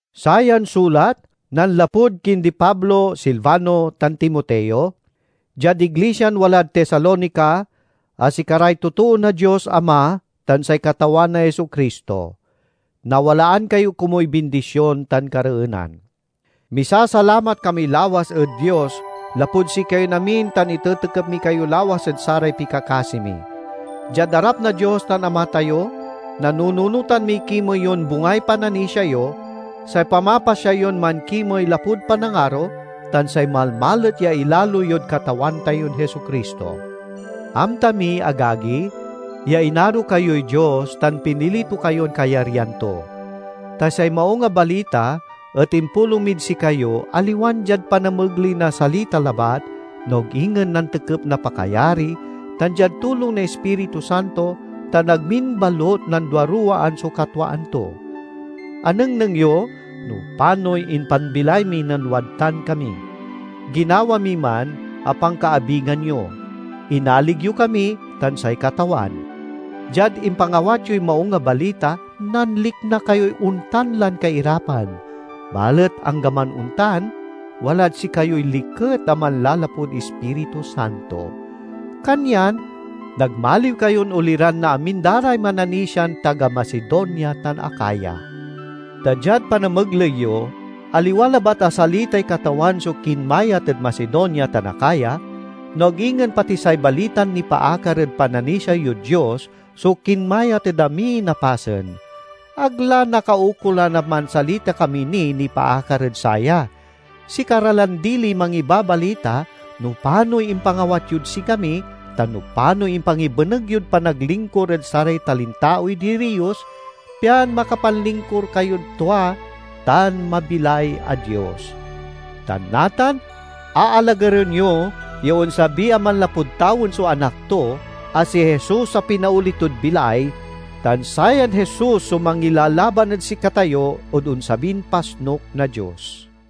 Sayan sulat nanlapud kindi Pablo, Silvano, tan Timoteo— Diad iglisian walad Tesalonica, a sikaray totoo na Dios Ama tan say Katawan a Jesu-Cristo: Nawalaan kayo komuy bindision tan kareenan. Misasalamat kami lawas ed Dios lapud sikayon amin tan itetekep mi kayo lawas ed saray pikakasi mi. Diad arap na Dios tan Ama tayo, nanunotan miy kimey yon bungay pananisia yo, say pamapasya yon mankimey lapud panangaro, tan say malmalet ya ilalo yod Katawan tayon Jesu-Cristo. Amta mi, agagi, ya inaro kayoy Dios tan pinili to kayon kayaryan to. Ta say Maung a Balita et impulong mid sikayo aliwan diad panamegley na salita labat, no ag ingen nantekep na pakayari, tan diad tulong na Ispiritu Santo, tan ag min balut nanduaruwaan so katwaan to. Anengneng yo no panoy impanbilay mi nen wadtan kami. Ginawa mi man a pankaabigan yo. Inalig yo kami tan say Katawan. Diad impangawat yoy Maung a Balita, nanlikna kayoy ontan lan kairapan; balet anggaman ontan, walad sikayoy liket a manlalapud Ispiritu Santo. Kanyan nagmaliw kayon oliran na amin da ray mananisian taga Macedonia tan Acaya. Ta diad panamegley yo aliwa labat a salitay Katawan so kinmayat ed Macedonia tan Acaya, no ag ingen pati say balitan nipaakar ed pananisia yod Dios so kinmayat ed amin a pasen. Ag la nakaukolan a mansalita kami niy nipaakar ed saya. Sikara lan diliy mangibabalita no panoy impangawat yod sikami, tan no panoy impangibeneg yod panaglingkur ed saray talintaoy diriyos, pian makapanlingkur kayod tua tan mabilay a Dios. Tan natan aalagaren yo ya onsabi a manlapud tawen so Anak to, a si Jesus a pinaoli tod bilay, tan sayan Jesus so mangilalaban ed sikatayo ed onsabin pasnuk na Dios.